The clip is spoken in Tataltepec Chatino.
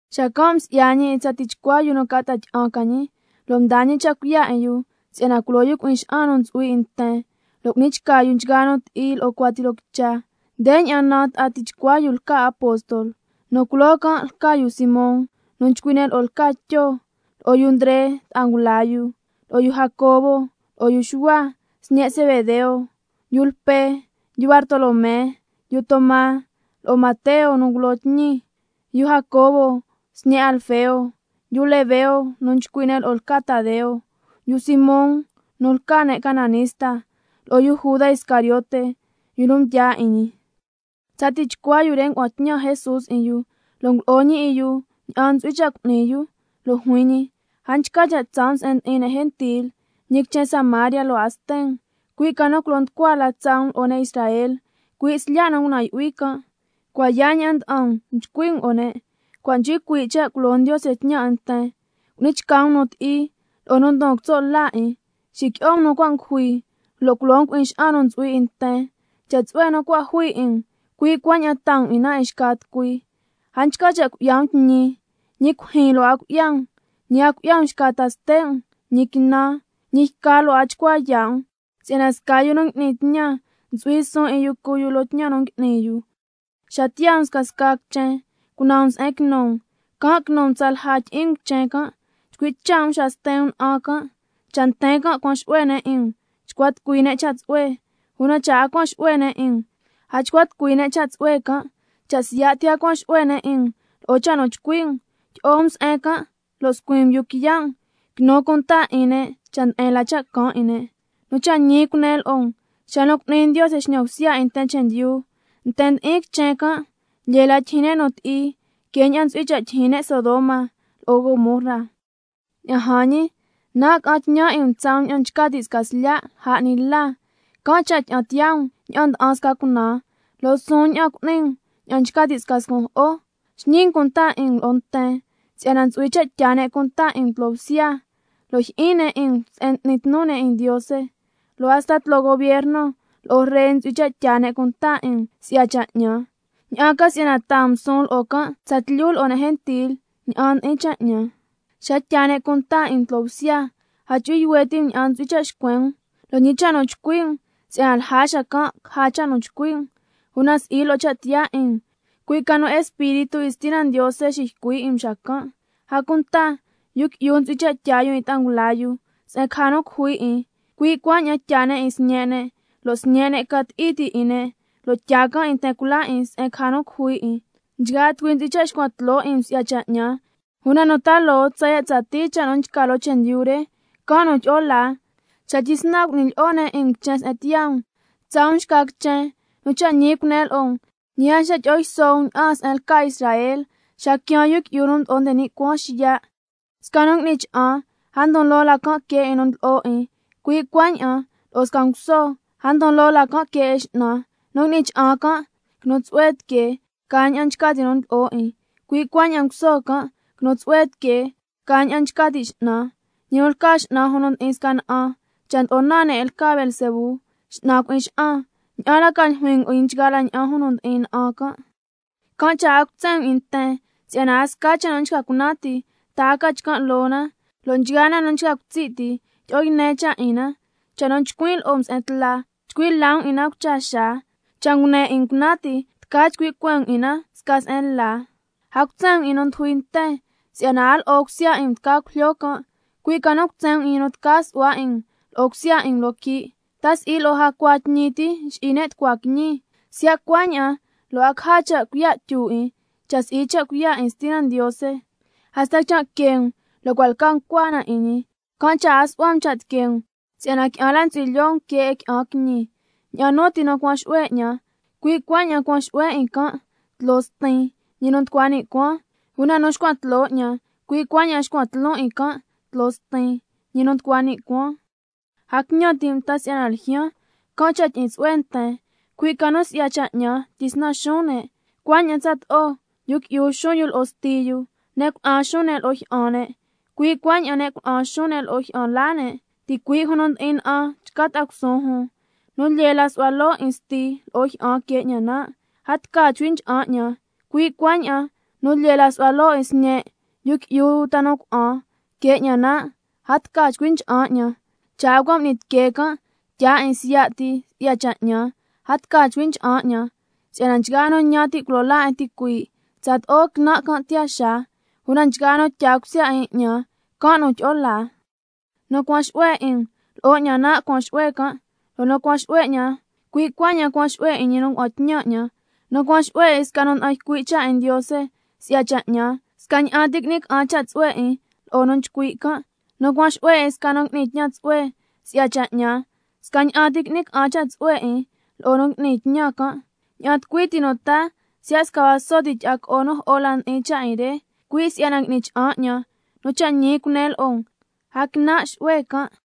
Xacan' msi'ya ñi 'in tsa tichcua yu nu ca ta'a tyi'an ca ñi, lo' mdaa ñi cha' cuiya' 'in yu si'yana culo yu cui'in xa'an nu ntsu'hui 'in nten, lo' cu'ni chca yu nchgaa nu ti'i lo'o cuati loo quicha. Ndeña'an naan ta'a tichcua yu nu lca apóstol: Nu culoo can' lca yu Simón nu nchcui' ne' lo'o lca Tyo, lo'o yu Ndre ta'a ngula yu, lo'o Jacobo lo'o yu Xuhua, sñe' Zebedeo, yu Lpe, yu Bartolomé, yu Toma, lo'o Mateo nu ngulo tñi, yu Jacobo, sñe' Alfeo, yu Lebeo nu nchcui' ne' lo'o lca Tadeo, yu Simón nu lca ne' cananista, lo'o yu Juda Iscariote, yu nu mdyaa 'in ñi. Tsa tichcua yu re ngua'an tñan Jesús 'in yu, lo' ngulo'o ñi 'in yu ña'an ntsu'hui cha' cu'ni yu, lo' juin ñi: A nchca cha' tsaa um se'en ndi'in ne' gentil, ñi quichen Samaria lo' a sten um, cui' ca nu culo nducua la tsaa um lo'o ne' Israel, cui' slya' nu ngunan' yu'hui can'. Cua' yaa ña'an nda'an um, chcui' um lo'o ne': Cua' nchcui cuii' cha' culo Ndiose tñan 'in nten. Cu'ni chca um nu ti'i, lo'o nu ndon quitso' la 'in, xiqui'o um nu cua' ngujui, lo' culo um cui'in xa'an nu ntsu'hui 'in nten. Cha' tsu'hue nu cua' jui 'in um, cui' cuaña'an taa um 'in na 'in xca tucui. A nchca cha' cui'ya um tñi, ñi cuijyin lo' a cui'ya um, ñi a cui'ya um xca ta ste' um, ñi quinan, ñi yca lo' a chcua yaa' um, si'yana sca yu nu n'ni tñan ntsu'hui suun 'in yu cu yu loo tñan nu ngui'ni yu. Xa tiyaa um scasca quichen cunan um se'en quinu um, can' quinu um tsalja tyi'in um quichen can'. Chcui' cha' um xa sten um na'an can'. Cha' nten can' cuan xu'hue ne' 'in um, chcua tucui ne' cha' tsu'hue, una cha' a cuan xu'hue ne' 'in um, a chcua tucui ne' cha' tsu'hue can'. Cha' siya' ti a cuan xu'hue ne' 'in um lo'o cha' nu nchcui' um, tyi'o um se'en can' lo' scuin um yuu quiya' um, quinu cunta 'in ne' cha' nde'en la cha' caan 'in ne'. Nu cha' ñi cunen lo'o um, xa cu'ni Ndiose xñan bsya 'in nten chendyu, nten ndi'in quichen can', lyee la tyijyin ne' nu ti'i que ña'an ntsu'hui cha' tyijyin ne' Sodoma lo'o Gomorra. Ña'an jan ñi, nan' ca'an tñan 'in um tsaa um ña'an nchca ti' sca slya' lja 'ni la, can' cha' tyi'an tiyaa um ña'an nda'an sca cunaan, lo' suun ña'an cu'ni um 'in um ña'an nchca ti' sca scun' jo'o. Xñi um cunta 'in um lo'o nten, si'yana ntsu'hui cha' tyaa ne' cunta 'in um tloo bsya, lo' jyi'in ne' 'in um se'en n'ni tnu ne' 'in Ndiose. Lo' hasta tloo gubierno lo'o ree ntsu'hui cha' tyaa ne' cunta 'in um si'ya cha' 'ñan, ña'an ca si'yana taa um suun lo'o can' tsatlyu lo'o ne' gentil ña'an ndi'in cha' 'ñan. Xa tyaa ne' cunta 'in um tloo bsya, a chu'hui yuhue ti' um ña'an ntsu'hui cha' xcuen um, lo' ñi cha' nu chcui' um, si'yana lja xacan' caja cha' nu chcui' um, una si'i lo'o cha' tiyaa 'in um, cui' ca nu Espíritu 'in Stina Ndiose xiycui' 'in um xacan'. A cunta yu qui'yu ntsu'hui cha' tyaa yu 'in ta'a ngula yu se'en caja nu cujui 'in, cui' cuaña'an tyaa ne' 'in sñe' ne', lo' sñe' ne' ca ti'i ti' 'in ne' lo' tyaa can' 'in nten cula 'in se'en caja nu cujui 'in. Nchgaa tucui ntsu'hui cha' xcuan tloo 'in um si'ya cha' 'ñan, una nu ta loo tsaya' tsatii cha' nu nchca loo chendyu re, can' nu tyi'o laa. Xa tyisnan cu'ni lyi'o ne' 'in um quichen se'en tiyaa um, tsaa um xca quichen. Nu cha' ñi cunen lo'o um, ñi a nchca tyi'o yso um ña'aan se'en lca Israel, xa quiaan Yu Qui'yu nu Mdo'o nde ni' Cuaan xiya'. Sca nu ngui'ni cha'an, a ndon loo la que 'in nu ndlo'o 'in, cui' cuaña'an lo'o sca nguso, a ndon loo la que 'in x'nan. Nu ngui'ni cha'an can', quinu tsu'hue tiquee ca ña'an nchca ti' nu ndlo'o 'in, cui' cuaña'an nguso can', quinu tsu'hue tiquee ca ña'an nchca ti' x'nan. Ñi nu lca x'nan jun nu ndi'in sca na'an, cha' ndlo'o naan ne' 'in lca Beelzebú, x'nan cui'in xa'an, ¿ña'an la ca ljuin um 'in nchgaa la ña'an jun nu ndi'in na'an can'? Can' cha' a cutsen um 'in nten, si'yana a sca cha' nu nchca cunan ti, ta a ca chcan' loo na, lo' nchgaa na nu nchca cutsi' ti, ndyi'o yne cha' 'in na. Cha' nu chcuin' lo'o um se'en tla, chcui' la um 'in na cucha xaa, cha' nu ngune 'in um cunan ti, tca chcui' cueen um 'in na sca se'en la. A cutsen um 'in nu ndujui nten, si'yana a lo'o cusya 'in um tca cujlyo can', cui' ca nu cutsen um 'in ñi nu tca su'hua 'in um lo'o cusya 'in um loo quii'. ¿Ta si'i lo'o jacua tñi ti nxi'i ne' tucua quiñi? Siya' cuaña'an, lo' a caja cha' cuiya' tyu 'in, cha' si'i si'ya cha' cuiya' 'in Stina Ndiose. Hasta quichan' que um, lo' cua' lca ncua na 'in ñi. Can' cha' a su'hua um cha' tiquee um, si'yana qui'an la ntsu'hui lyoo um que 'in qui'an quiñi. Ña'an nu ti nu cuan xu'hue 'ñan, cui' cuaña'an cuan xu'huen 'in can' tloo Stin, ñi nu nducua ni' cuaan. Una nu xcuan tloo 'ñan, cui' cuaña'an xcuan tloon 'in can' tloo Stin, ñi nu nducua ni' cuaan. A quiñan ti' um ta si'yana ljyaan, can' cha' tyi'in tsu'hue nten, cui' ca nu si'ya cha' 'ñan tyisnan xuun ne'. Cuaña'an tsato'o —yu qui'yu xuun yu lo'o sti yu, ne' cuna'an xuun ne' lo'o jyi'an ne', cui' cuaña'an ne' cuna'an xuun ne' lo'o jyi'an laa ne', ticuii' jun nu ndi'in na'an chca ta'a cusuun jun—. Nu lyee la nsu'hua loo 'in sti lo'o jyi'an que 'ñan nan', a tca chcui ncha'an 'ñan. Cui' cuaña'an nu lyee la nsu'hua loo 'in sñe' yu qui'yu uta nu cuna'an que 'ñan nan', a tca chcui ncha'an 'ñan. Cha' a cua' m'ni tiquee can' tyaa 'in siya' ti si'ya cha' 'ñan, a tca chcui ncha'an 'ñan. Si'yana nchgaa nu ñan ti' culo laa 'in ticuii', tsato'o quinan' can' tiyaa xaa, una nchgaa nu tyaa cusya 'in 'ñan, can' nu tyi'o laa. Nu cuan xu'hue 'in um, lo'o 'ñan nan' cuan xu'hue can', lo' nu cuan xu'hue 'ñan, cui' cuaña'an cuan xu'hue 'in ñi nu ngua'an tñan 'ñan. Nu cuan xu'hue 'in sca nu nda'an ycui' cha' 'in Ndiose, si'ya cha' 'ñan, scaña'an ti qui'ni ca'an cha' tsu'hue 'in lo'o nu nchcui' can'. Nu cuan xu'hue 'in sca nu ngui'ni tñan tsu'hue, si'ya cha' 'ñan, scaña'an ti qui'ni ca'an cha' tsu'hue 'in lo'o nu ngui'ni tñan can'. Ña'an tucui ti nu taa siya' sca vaso ti tyi'a co'o nu jo'o la ndi'in cha' 'in re, cui' si'yana ngui'ni cha'an 'ñan, nu cha' ñi cunen lo'o um, a quinan' xu'hue ntsu'hui 'in can'.